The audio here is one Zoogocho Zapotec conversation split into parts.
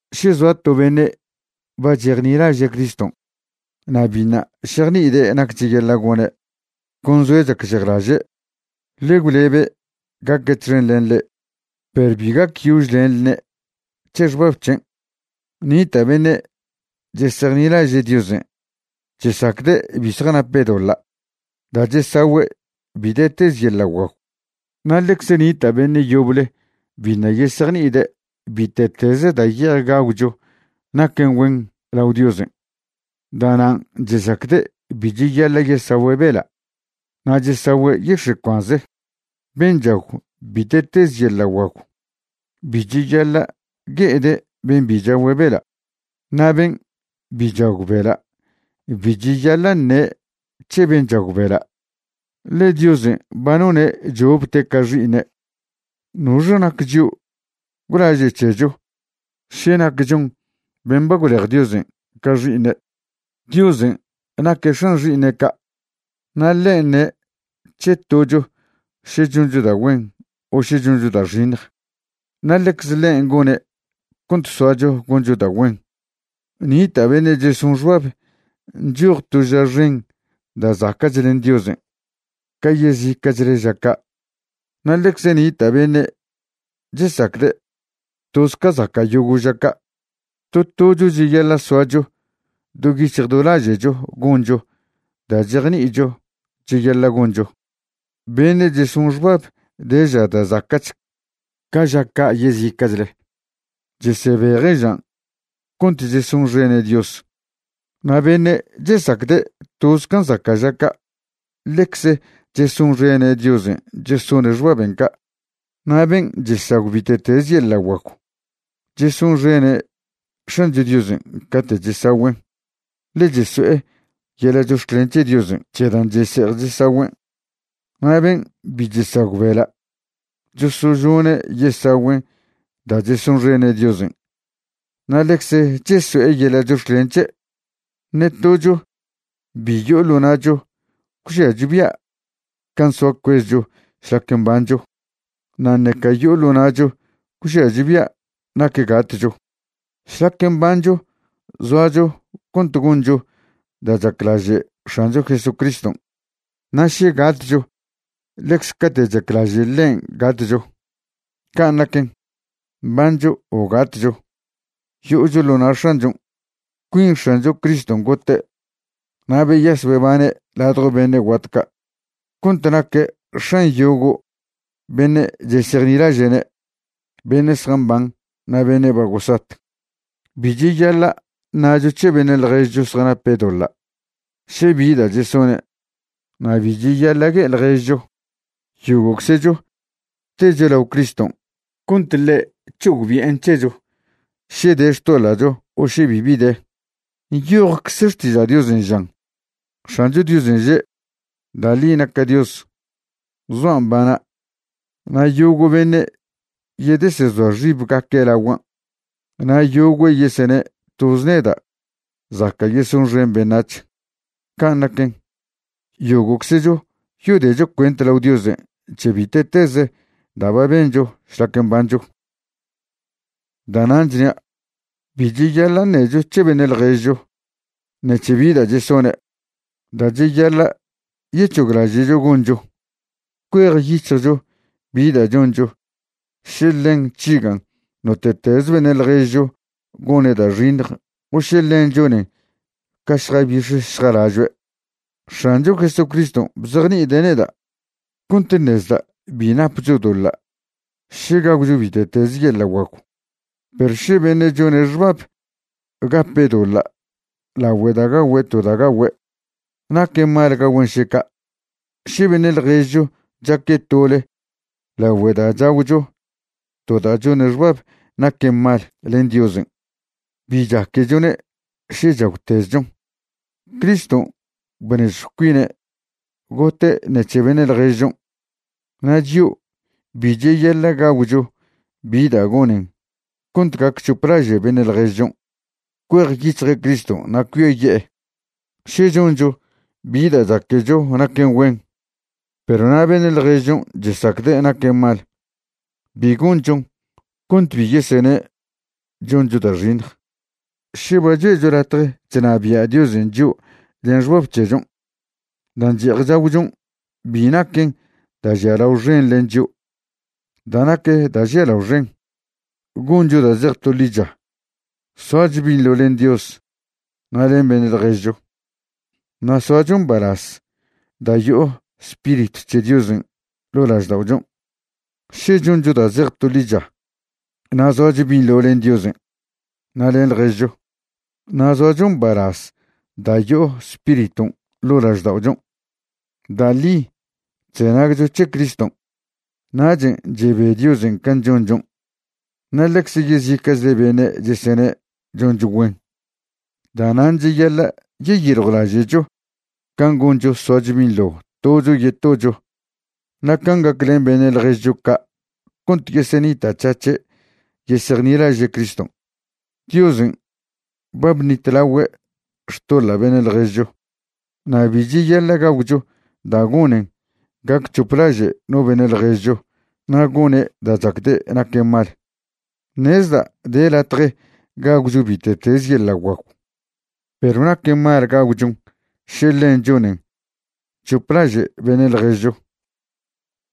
Še zoa to beṉe' ba chejnilaže' Criston' na' biṉa' šejni'ide' nac cheyaḻa' gone', con zoe' chacžejlaže', ḻe gwlebe' gaque' txen len le'e, perw bi gacyožlenḻne' c̱he xbab c̱hen'. Nita' beṉe' chesejnilaže' Diosen' chesacde' bi zjanape' doḻa' da' chesagüe' bite'teze yeḻa' guagw, na' ḻecz nita' beṉe' yoble biṉa' yesejni'ide' bite'teze da' ye'ej gagwcho naquen güen lao Diosen'. Da'nan' chesacde' bi cheyaḻa' yesagüe' bela' na' chesagüe' yix̱e' cuanze. Ben' chagw bite'teze yeḻa' guagw bi cheyaḻa' gue'ede' ben' bi chagüe' bela', na' ben' bi chagw bela' bi cheyaḻa' ṉe' c̱he ben' chagüe' bela', ḻe Diosen' ba none' chopte' ca xi'iṉe'. ¿Noxe nac chio' gwlaže' c̱hecho še nac chon ben' ba gwlej Diosen' ca xi'iṉe'? Diosen' naque' X̱an xi'iṉe' ca', na' ḻen' ṉe' c̱he to tocho še choncho da' güen o še choncho da' xiṉj. Na' ḻecze ḻen' gone' cont soacho goncho da' güen. Nita' beṉe' cheson xbab nchoj to ža xen da' zaca'ch len Diosen' ca yezica'chle ža ca', na' ḻecze nita' beṉe' chesacde' toz ca zaca' yogo' ža ca'. To tocho cheyaḻa' soacho do yic̱hj do laže'cho goncho da' chejni'icho cheyaḻa' goncho. Beṉe' cheson xbab de ža da' zaca'ch ca ža ca' yezica'chle, chesebeje' žan' cont chesonxene' Dios. Na' beṉe' chesacde' toz can' zaca' ža ca', ḻecze chesonxene' Diosen' chesone' xbaben' ca'. Na' ben' chesagw bite'tez yeḻa' guagw, chesonxene' X̱ancho Diosen' cate' chesagüen', ḻe cheso'e yeḻa' chox̱clen c̱he Diosen' c̱he dan' chese'ej chesagüen'. Na' ben' bi chesagw bela', chosožone' yesagüen' da' chesonxene' Diosen' na' ḻecze cheso'e yeḻa' chox̱clen c̱he'. Ṉe tocho bi yo'o ḻo na'cho gwžiacho bia' can' soa cuezcho šlaque mbancho, na' ṉeca yo'o ḻo na'cho gwžiacho bia' nac gatcho. Šlac mbancho zoacho cont goncho da' chaclaže' X̱ancho Jesucriston', na' še gatcho ḻecze cate' chaclaže' ḻen' gatcho. Can' naquen, mbancho o gatcho, yo'ocho ḻo na' X̱anchon'. Cuin X̱ancho Criston' gote' na' beyas bebane' ladjo beṉe' guat ca' cont naque' X̱an yogo' beṉe' chesejnilaže'ne' beṉe' zjamban na' beṉe' ba gosat. Bi cheyaḻa' ṉacho c̱he beṉe' ḻježcho zjanape' doḻa' še bi da' chesone', na' bi cheyaḻa' gue'e ḻježcho. Yogo'czecho techo lao Criston' cont ḻe' c̱hogbi'en c̱hecho še de xtoḻa'cho o še bibi de. Nyojcze Xtiža' Diosen' žan: X̱ancho Diosen' že': Da' ḻi naca' Dios, zoa' mbana', na' yogo' beṉe' yedesezoa xibgaque' laguan', na' yogüe' yesene' toz neda' zaca' yesonxen beṉac̱h. Can' naquen, yogo'czecho yodecho cuent lao Diosen' c̱he bite'teze da' ba bencho šlac mbancho. Da'nan' chnia', bi cheyaḻa' ṉecho c̱he beṉe' ḻježcho ṉec̱he bi da' chesone'. Da' cheyaḻa' yec̱hoglaže'cho goncho, cuejyic̱hjcho bi da' choncho še ḻen chžigan' note'teze beṉe' ḻježcho gone' da' xiṉj o še ḻen chonen ca šjabix̱ šjalažoe'. X̱ancho Jesucriston' bzejni'ide' neda' cont ṉezda' bi napcho doḻa' še gagwcho bite'teze yeḻa' guagw. Perw še beṉe' chone' xbab gape' doḻa' lagüe da' gagüe' to da' gagüe', naquen mal gagüen' še ca'. Še beṉe' ḻježcho chaque' tole lagüe da' chagwcho to da' chone' xbab naquen mal len Diosen', bi chaquechone' še chagwtezchon. Criston' bnežjw cuine' gote' ṉec̱he beṉe' ḻježchon', na' chio' bi cheyaḻa' gagwcho bi da' gonen cont gac c̱hoplaže' beṉe' ḻježchon' cuejyic̱hje' Criston' na' cuiaye'e. Še choncho bi da' chaquecho naquen güen, perw na' beṉe' ḻježchon' chesacde' naquen mal, bi gonchon cont bi yesene' choncho da' xiṉj. Še ba choe'cho latje chnabia' Diosen' chio' len xbab c̱hechon', dan' che'ej chagwchon' bi naquen da' žialao xen len chio'. Da' nac da' žialao xen, goncho da' zej to ḻicha, soacho binḻo len Dios na' len beṉe' ḻježcho, na' soacho mbalaz da' yo'o Spiritw c̱he Diosen' ḻo' lažda'ochon'. Še choncho da' zej to ḻicha, na' zoacho binḻo len Diosen' na' len ḻježcho, na' zoacho mbalaz da' yo'o Spiriton' ḻo' lažda'ochon', da' ḻi chzenagcho c̱he Criston'. Nachen' chebe Diosen' can' chonchon', na' ḻecze yezica'chle beṉe' chesene' choncho güen. Da'nan' cheyaḻa' yeyiljwlaže'cho can' goncho soacho binḻo tocho yetocho na' can' gaclen beṉe' ḻježcho ca' cont yesenita'c̱hac̱he' yesejnilaže' Criston'. Diosen' ba bṉitlagüe' xtoḻa' beṉe' ḻježcho na' bi cheyaḻa' gagwcho da' gonen gac c̱hoplaže' no beṉe' ḻježcho na' gone' da' chacde' naquen mal. Ṉezda' de latje gagwcho bite'teze yeḻa' guagw, perw naquen mal gagwchon še ḻen chonen c̱hoplaže' beṉe' ḻježcho.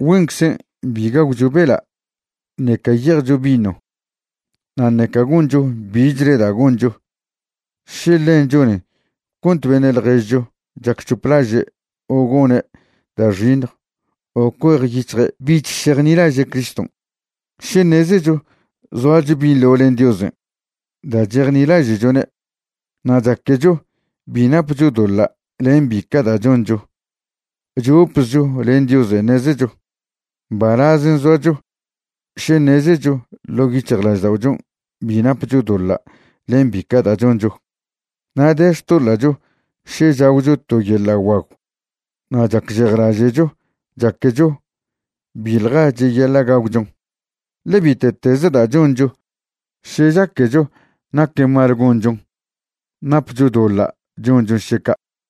Güenczen bi gagwcho bela' ṉeca ye'ejcho vino na' ṉeca goncho bichle da' goncho še ḻen chonen cont beṉe' ḻježcho chacc̱hoplaže' o gone' da' xiṉj o cuejyic̱hje' bich šejnilaže' Criston'. Še ṉezecho zoacho binḻo len Diosen' da' chejnilaže'chone' na' chaquecho bi napcho doḻa' len bica' da' choncho, chopzcho len Diosen' ṉezecho. Mbalazen' zoacho še ṉezecho ḻo' yic̱hjlažda'ochon' bi napcho doḻa' len bica' da' choncho. Na' de xtoḻa'cho še chagwcho to yeḻa' guagw na' chacžejlaže'cho chaquecho biḻja cheyaḻa' gagwchon, ḻe bite'teze da' choncho še chaquecho naquen mal gonchon, napcho doḻa' chonchon še ca'.